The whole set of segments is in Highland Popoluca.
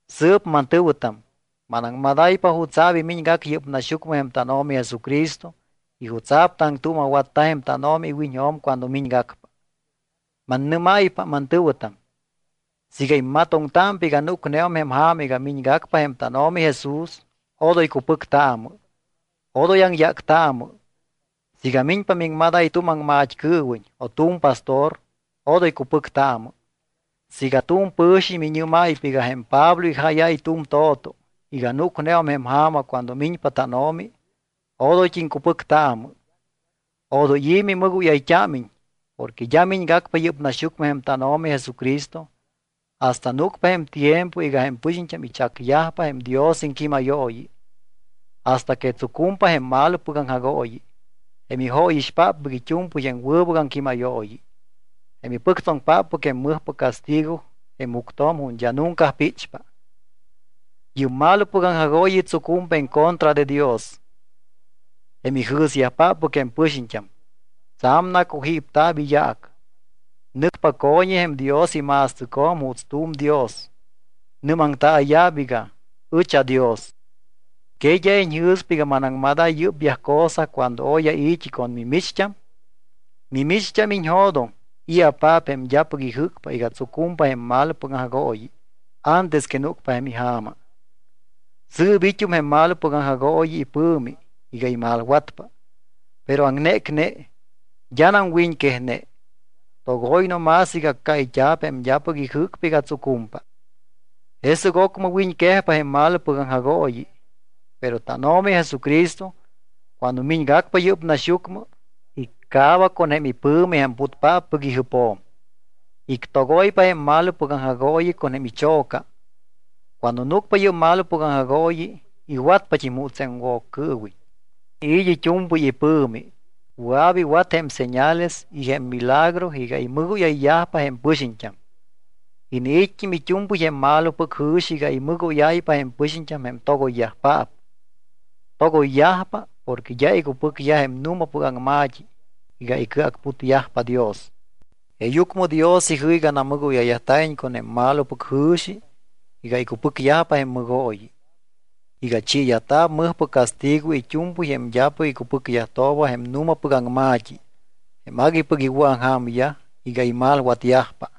Sɨɨp, mantɨ̱wɨtam, manaŋmadáypa jutsa̱p imiñgac yɨ́p naxyucmɨ jém tánO̱mi Jesucristo y jutsa̱p taŋtuuma̱watta jém tánO̱mi iwiñjo̱m cuando miñgacpa. Mannɨ́máypa, mantɨ̱wɨtam, siiga immatoŋtámpa iga núcneum jém ja̱ma iga miñgacpa jém tánO̱mi Jesús, odoy cupɨctaamɨ, odoy aŋyáctaamɨ. Siiga miñpa miŋmadáy tu̱m aŋmat́cɨɨwiñ o tu̱m pastor, odoy cupɨctaamɨ. Siiga tu̱m pɨ̱xiñ miñɨ́máypa iga jém Pablo ijáyáy tu̱m to̱to iga núcneum jém ja̱ma cuando miñpa tánO̱mi, odoyt́im cupɨctaamɨ. Odoy i̱ mimɨgóyayt́ámiñ porque d́a miñgacpa yɨ́p naxyucmɨ jém tánO̱mi Jesucristo hasta núcpa jém tiempo iga jém pɨxiñt́am ichacyajpa jém Dios iŋquímayooyi, hasta que tsucumpa jém malopɨc aŋjagooyi, jém ijóyixpáppɨc it́u̱mpɨy jém wɨbɨc aŋquímayooyi, jém ipɨctsoŋpáppɨc jém mɨjpɨc castigo jém juctjo̱m ju̱t́ d́a nunca píchpa. Yɨ́p malopɨc aŋjagooyi tsucumpa en contra de Dios, jém ijɨ̱syajpáppɨc jém pɨxiñt́am. Tsa̱m nacujípta̱p iyaac. Nɨcpa co̱ñi jém Dios ima̱stɨcjo̱m juuts tu̱m dios. Nɨ́maŋtaaya̱p iga: Ɨch aDios. ¿Que d́a iñjɨ̱spa iga manaŋmadáy yɨ́pyaj cosa cuando oy ai̱t́i con mimicht́am? Mimicht́am, iñjo̱doŋ i̱apaap jém d́apɨc ijɨ́cpa iga tsucumpa jém malopɨc aŋjagooyi antes que núcpa jém ija̱ma. Sɨɨp it́um jém malopɨc aŋjagooyi ipɨ̱mi iga imalwatpa, pero aŋnécne, d́anam wiñquejne. Togoy no más iga accáyt́a̱p jém d́apɨc ijɨ́cpa iga tsucumpa. Jesɨc ocmɨ wiñquejpa jém malopɨc aŋjagooyi, pero tánO̱mi Jesucristo, cuando miñgacpa yɨ́p naxyucmɨ, iccaaba con jém ipɨ̱mi jém putpáppɨc ijɨpjo̱m, ictogoypa jém malopɨc aŋjagooyi con jém icho̱ca. Cuando núcpa yɨ́p malopɨc aŋjagooyi, iwatpat́im juuts jém Woccɨɨwiñ. Iniit́ it́u̱mpɨy ipɨ̱mi, wɨa̱p iwat jém señales y jém milagro iga imɨgóyayyajpa jém pɨxiñt́am. Iniit́t́im it́u̱mpɨy jém malopɨc jɨ̱xi iga imɨgóyáypa jém pɨxiñt́am jém togoyyajpaap. Togoyyajpa porque d́a icupɨcyaj jém nu̱mapɨc aŋma̱t́i iga icɨacputyajpa Dios. Jeeyucmɨ Dios ijɨ́c iga namɨgóyayyajta̱iñ con jém malopɨc jɨ̱xi iga icupɨcyajpa jém mɨgooyi, iga chiiyajta̱p mɨjpɨc castigo it́u̱mpɨy jém d́apɨc icupɨcyajtooba jém nu̱mapɨc aŋma̱t́i, jém aguipɨc iwɨ̱aŋja̱myaj iga imalwatyajpa.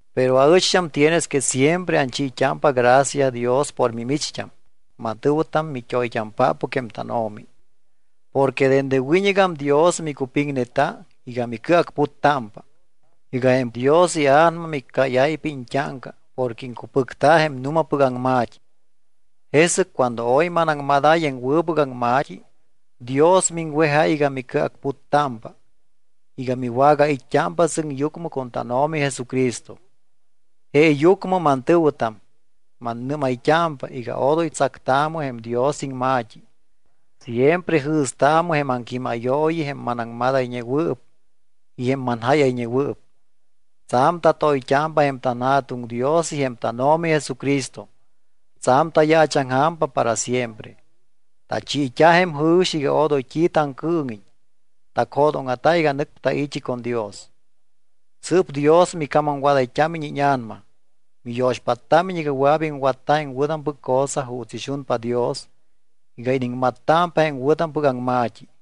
Pero aɨcht́am tienes que siempre anchiit́ámpa gracia Dios por mimicht́am, mantɨ̱wɨtam, mit́oyt́ampáppɨc jém tánO̱mi, porque dende wiñɨgam Dios micupiŋneta iga micɨacputtámpa, iga jém Dios iA̱nama miccáyáypa iñt́áŋca porque iŋcupɨcta jém nu̱mapɨc aŋma̱t́i. Jesɨc cuando oy manaŋmadáy jém wɨbɨc aŋma̱t́i, Dios miŋwejáy iga micɨacputtámpa iga miwagait́t́ámpa sɨŋyucmɨ con tánO̱mi Jesucristo. Jeeyucmɨ, mantɨ̱wɨtam, mannɨ́mayt́ámpa iga odoy tsactaamɨ jém Dios iŋma̱t́i. Siempre jɨ̱staamɨ jém aŋquímayooyi, jém manaŋmadayñewɨɨp y jém manjáyayñewɨɨp. Tsa̱m tatoyt́ámpa jém tanJa̱tuŋ Dios y jém tánO̱mi Jesucristo. Tsa̱m tayaachaŋja̱mpa para siempre. Tachiit́a jém jɨ̱xi iga odoy t́i taŋcɨɨŋiñ. Tacjo̱dóŋa̱ta iga nɨcpa tai̱t́i con Dios. Sɨɨp Dios micamamwadayt́ámiñ íña̱nama, miyo̱xpáttámiñ iga wɨa̱p iŋwatta jém wɨ̱tampɨc cosa juuts ixunpa Dios iga iniŋmattámpa jém wɨ̱tampɨc aŋma̱t́i.